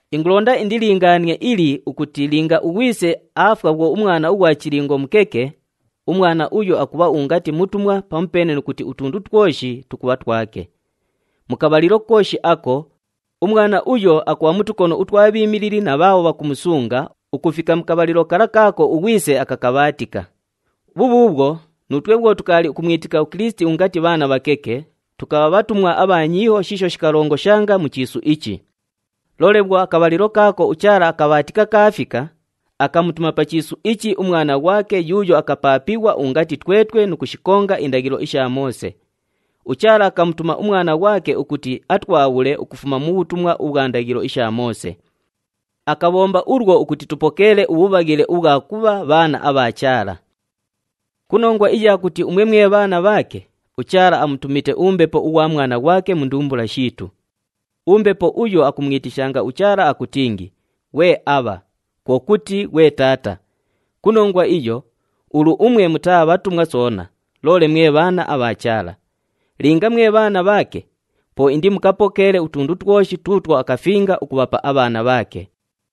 Ingulonda indilingaanie ili ukuti linga ughwise aafwa bhwo umwana ughwa chilingo mukeke, umwana uyo akubha ungati mutumwa pamupeene nu kuti utundu twoshi tukubha twake. Mu kabhalilo kooshi ako, umwana uyo akubha mu tukono utwa bhiimilili na bhaabho bhakumusunga ukufika mu kabhalilo kala kaako ughwise akakabhaatika. Bhubhuubhwo, nuutwe bhwo tukaali ukumwitika uKilisiti ungati bhaana bhakeke, tukabha bhatumwa abha nyiiho shiisho shikalongoshanga mu chiisu ichi. Loole bhwo akabhalilo kaako uChaala akabhaatika kaafika, akamutuma pa chiisu ichi uMwana ghwake yuuyo akapaapighwa ungati twetwe nu kushikonga indaghilo isha Moose. UChaala akamutuma uMwana ghwake ukuti atwabhule ukufuma mu bhutumwa ubhwa ndaghilo isha Moose. Akabhomba ulwo ukuti tupokeele ubhubhaghile ubhwa kubha bhaana abha Chaala. Ku nongwa iya kuti umwe mwe bhaana bhaake, uChaala amutumite uMbepo ughwa Mwana ghwake mu ndumbula shiitu. UMbepo uyo akumwitishanga uChaala akutingi, “Ghwe Aabha,” kwo kuti, “Ghwe Taata.” Ku nongwa iyo, ulu umwe mutaa bhatumwa soona, loole mwe bhaana abha Chaala. Linga mwe bhaana bhaake, po indimukapokeele utundu twoshi tuutwo akafinga ukubhapa abhaana bhaake.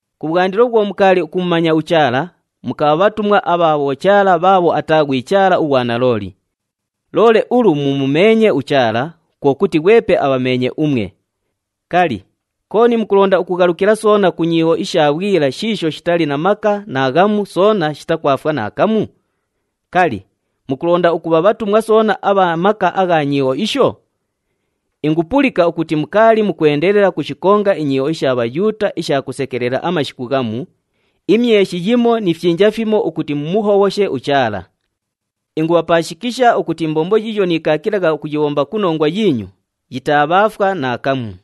Kubhwandilo bhwo mukaali ukumumanya uChaala, mukabha bhatumwa abha bhochaala bhaabho ataa ghwi Chaala ughwa nalooli. Loole ulu mumumeenye uChaala, kwo kuti ghwepe abhameenye umwe. Kali, kooni mukulonda ukughalukila soona ku nyiiho isha bhwila shiisho shitali na maka naaghamu soona shitakwafwa naakamu? Kali, mukulonda ukubha bhatumwa soona abha maka agha nyiiho isho? Ingupulika ukuti mukaali mukwendelela ukushikonga inyiiho isha Bhayuuta isha kusekelela amashiku ghamu, imyeshi yimo ni fyinja fimo ukuti mumuhobhoshe uChaala. Ingubhapaashikisha ukuti imbombo yiiyo niikaakilagha ukuyibhomba ku nongwa yiinyu, yitaabhaafwa naakamu.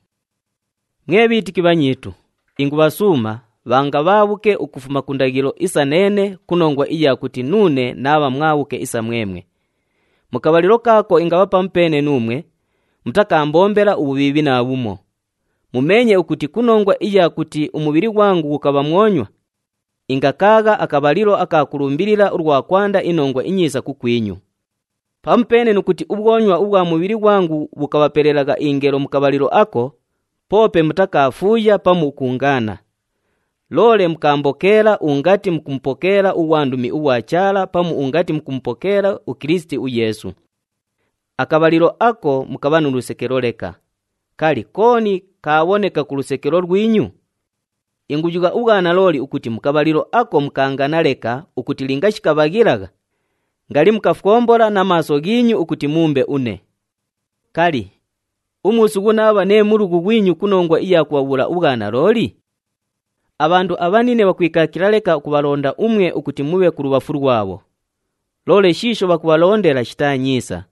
Mwe bhiitiki bhanyiitu, ingubhasuuma, bhanga bhaabhuke ukufuma ku ndaghilo isa neene ku nongwa iya kuti nuune naabha mwabhuke isa mwemwe. Mu kabhalilo kaako ingabha pamupeene nuumwe, mutakaambombela ubhubhiibhi naabhumo. Mumeenye ukuti ku nongwa iya kuti umubhili ghwangu ghukabha mwonywa, ingakaagha akabhalilo aka kulumbilila ulwa kwanda iNongwa iNyiisa kukwinyu. Pamupeene nu kuti ubhwonywa ubhwa mubhili ghwangu bhukabhapelelagha ingelo mu kabhalilo ako, poope mutakaafuuya pamu ukuungaana. Loole mukaambokeela ungati mukumupokeela ughwandumi ughwa Chaala pamu ungati mukumupokeela uKilisiti uYeesu. Akabhalilo ako mukabha nu lusekelo leka. Kali, kooni kaabhoneka ku lusekelo lwinyu? Inguyugha ubhwanalooli ukuti mu kabhalilo ako mukaangana leka ukuti linga shikabhaghilagha, ngali mukafwombola na maaso ghiinyu ukuti muumbe une. Kali, umuusughu naabha nee mulughu ghwinyu ku nongwa iya kubhabhuula ubhwanalooli? Abhandu abhanine bhakwikaakila leka ukubhalonda umwe ukuti mubhe kulubhafu lwabho, loole shiisho bhakubhalondela shitaa nyiisa.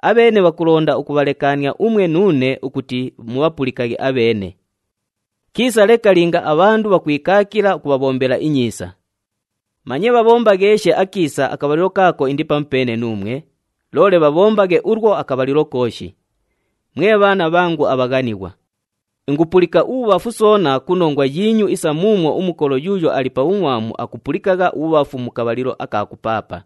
Abheene bhakulonda ukubhalekaania umwe nuune ukuti mubhapulikaghe abheene. Kiisa leka linga abhandu bhakwikaakila ukubhabhombela inyiisa. Manye bhabhombagheeshe akiisa akabhalilo kaako indi pamupeene nuumwe, loole bhabhombaghe ulwo akabhalilo kooshi. Mwe bhaana bhangu abhaghanighwa, ingupulika ubhubhafu soona ku nongwa yiinyu isa muumwo umukolo yuuyo ali pa bhungʼwamu akupulikagha ubhubhafu mu kabhalilo aka kupaapa.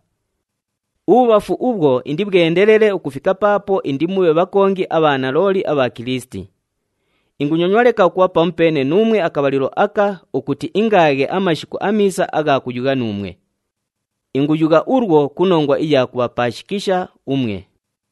Ubhubhafu ubhwo indibhwendelele ukufika paapo indimubhe bhakongi abha nalooli abha Kilisiti. Ingunyonywa leka ukubha pamupeene nuumwe akabhalilo aka ukuti ingaaghe amashu amiisa agha kuyugha nuumwe. Inguyugha ulwo ku nongwa iya kubhapaashikisha umwe.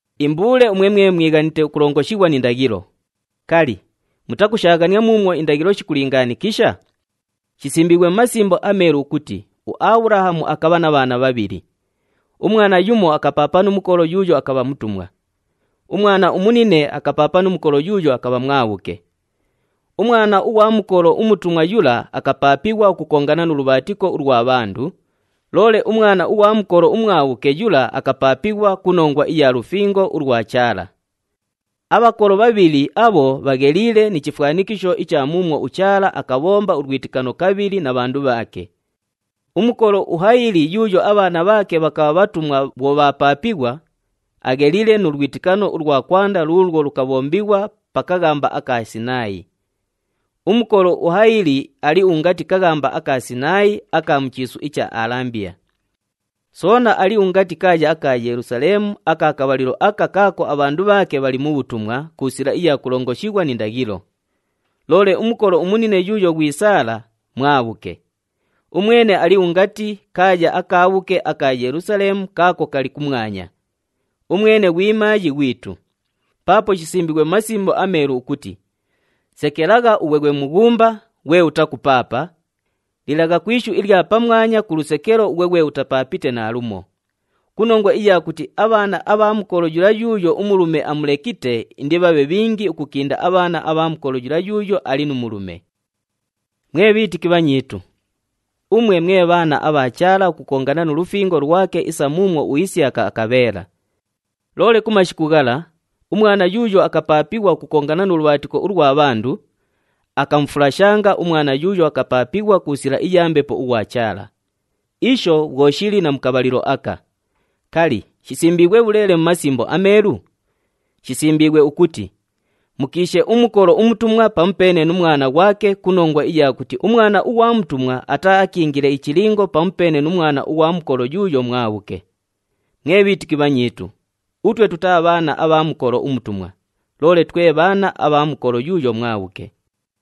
Imbuule umwe mwe mwighanite ukulongoshighwa ni ndaghilo, kali, mutakushaaghania muumwo indaghilo shikulingaanikisha? Shisimbiighwe mu Masimbo aMeelu ukuti uAbhulahamu akabha na bhaana bhabhili. Umwana yumo akapaapa nu mukolo yuuyo akabha mutumwa. Umwana umunine akapaapa nu mukolo yuuyo akabha mwabhuke. Umwana ughwa mukolo umutumwa yula akapaapighwa ukukongana nu lubhaatiko ulwa bhandu, loole umwana ughwa mukolo umwabhuke yula akapaapighwa ku nongwa iya lufingo ulwa Chaala. Abhakolo bhabhili abho bhagheliile ni chifwanikisho icha muumwo uChaala akabhomba ulwitikano kabhili na bhandu bhaake. Umukolo uHayili yuuyo abhaana bhaake bhakabha bhatumwa bhwo bhaapaapighwa, agheliile nu lwitikano ulwa kwanda luulwo lukabhombighwa pa kaghamba aka Sinaayi. Umukolo uHayili ali ungati kaghamba aka Sinaayi aka mu chiisu icha Alambiya. Soona ali ungati kaaya aka Yelusaleemu aka kabhalilo aka kaako abhandu bhaake bhali mu bhutumwa ku sila iya kulongoshighwa ni ndaghilo. Loole umukolo umunine yuuyo ghwi Saala, mwabhuke. Umwene ali ungati kaaya akaabhuke aka Yelusaleemu kaako kali kumwanya. Umwene ghwi maayi ghwitu. Paapo shisimbiighwe mu Masimbo aMeelu ukuti, “Sekelagha ughwe ghwe mughumba, ghwe utakupaapa, lilagha ku ishu ilya pamwanya ku lusekelo ughwe ghwe utapaapite naalumo, ku nongwa iya kuti abhaana abha mukolo yula yuuyo umulume amulekite indibhabhe bhingi ukukinda abhaana abha mukolo yula yuuyo ali nu mulume.” Mwe bhiitiki bhanyiitu, umwe mwe bhaana abha Chaala ukukongana nu lufingo lwake isa muumwo uIsiyaka akabheela. Loole ku mashiku ghala, umwana yuuyo akapaapighwa ukukongana nu lubhaatiko ulwa bhandu, akamufulashanga umwana yuuyo akapaapighwa ku sila iya Mbepo ughwa Chaala. Isho bhwo shili na mu kabhalilo aka. Kali, shisimbiighwe bhuleele mu Masimbo aMeelu? Shisimbiighwe ukuti, “Mukiishe umukolo umutumwa pamupeene nu mwana ghwake ku nongwa iya kuti umwana ughwa mutumwa ataaakiingile ichilingo pamupeene nu mwana ughwa mukolo yuuyo mwabhuke.” Mwe bhiitiki bhanyiitu, utwe tutaa bhaana abha mukolo umutumwa, loole twe bhaana abha mukolo yuuyo mwabhuke.